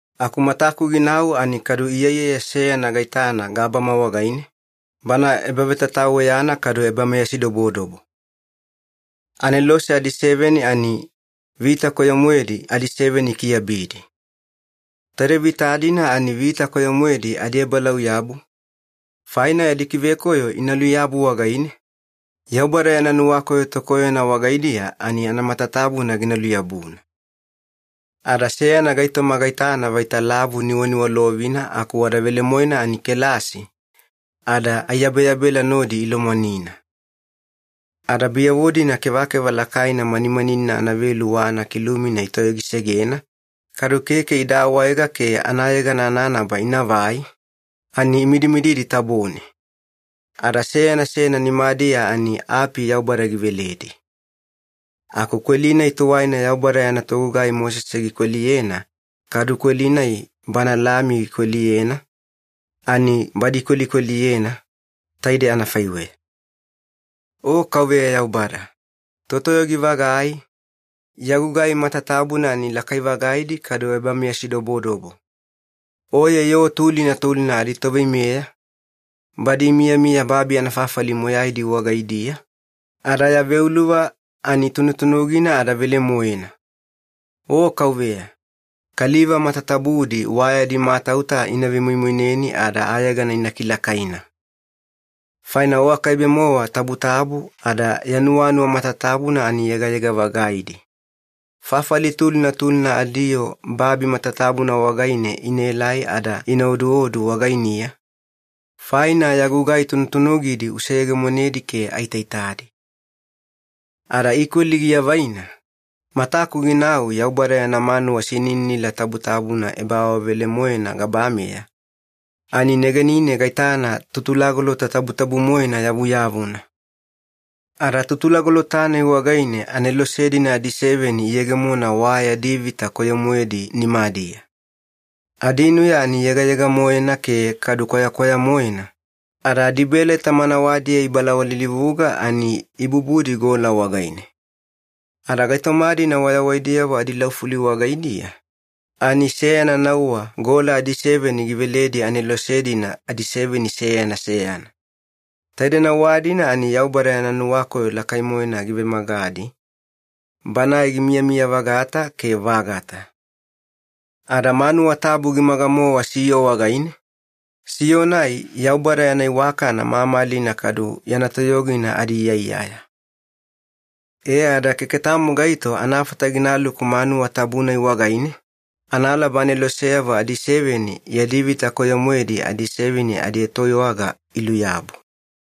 Aku mataku ginau ani kadu iyaiyaya seyana gaitana gabama wagaine, bana ebavetataweyana kadu ebameyasidobodobo. Anelose adiseveni ani vita koyo-moedi adiseveni ikiveyabidi. Taide vita-dina ani vita koyo-moedi adiebalauyabu, faina yadi kivekoyo ina luyabu wagaine, Yaubada yana nuwakoyo tokoyona wagaidiya ani anamatatabuna gina luyabuna. Ada seyana gaitoma gaitana vaita lavu niwaniwalovina aku wada velemoena ani kelasi, ada aiyabeyabela nodi ilomwanina. Ada biyavo-dina kevakeva lakaina manimaninina anavelu wa anakilumina itoyogisegena, kadu keke ida awaega ke anayegana ananaba inavai, ani imidimididi tabone. Ada seyana seyana nimadiya ani api Yaubada giveledi. Aku kweli-nai tuwaina Yaubada yana togugai Mosese gikweliyena, kadu kweli-nai Bana Lami gikweliyena, ani badi ikwelikweliyena, taide anafaiweya. “O Kauveya Yaubada, Totoyogi-vagai, Ya gugai matatabuna ani lakai-vagaidi kadu ebameyasidobodobo. Oye yoo tulina tulina adiToveimeya, badi imiyamiya babi anafafali moyaidi wagaidiya, ada Ya veuluva ani tunutunugina ada velemoena. O Kauveya, kaliva matatabudi wa yadi matauta ina vemoimoineni ada ayegana ina kilakaina. Faina O akaibe-mowa tabutabu ada Ya nuwanuwa matatabuna ani yegayega-vagaidi. Fafali tulina tulina adiyoo babi matatabuna wagaine inaelai ada ina oduodu wagainiya, faina Ya gugai tunutunugidi useyegemonedi ke aitaitadi.” Ada ikweli giavaina, mataku ginau Yaubada yana manuwa sinininila tabutabuna ebaawavelemoena gabameya, ani negenine gaitana Tutulagolota Tabutabu-moena yavuyavuna. Ada Tutulagolota-nai wagaine anelose-dina adiseveni iyegemona wa yadi vita koyo-moedi nimadiya. Adinuya ani yegayega-moena ke kadu kwayakwaya-moena, ada adibeleta manawadiya ibalawalilivuga ani ibubudi gola wagaine. Ada gaitoma-dina wayawaidiyavo adilaufuli wagaidiya, ani seyana nauwa gola adiseveni giveledi anelose-dina adiseveni seyana seyana. Taide nauwa-dina ani Yaubada yana nuwakoyo lakai-moena givemagadi, Banae gimiyamiya-vagata ke vagata. Ada manuwa tabu gimaga-mowa siyo wagaine, siyo-nai Yaubada yana iwakana mamalina kadu yana toyogina adiiyaiyaya. E ada keke tamo gaito anafata ginaluku manuwa tabu-nai wagaine, analaba aneloseyavo adiseveni yadi vita koyo-moedi adiseveni adietoiwaga iluyabu.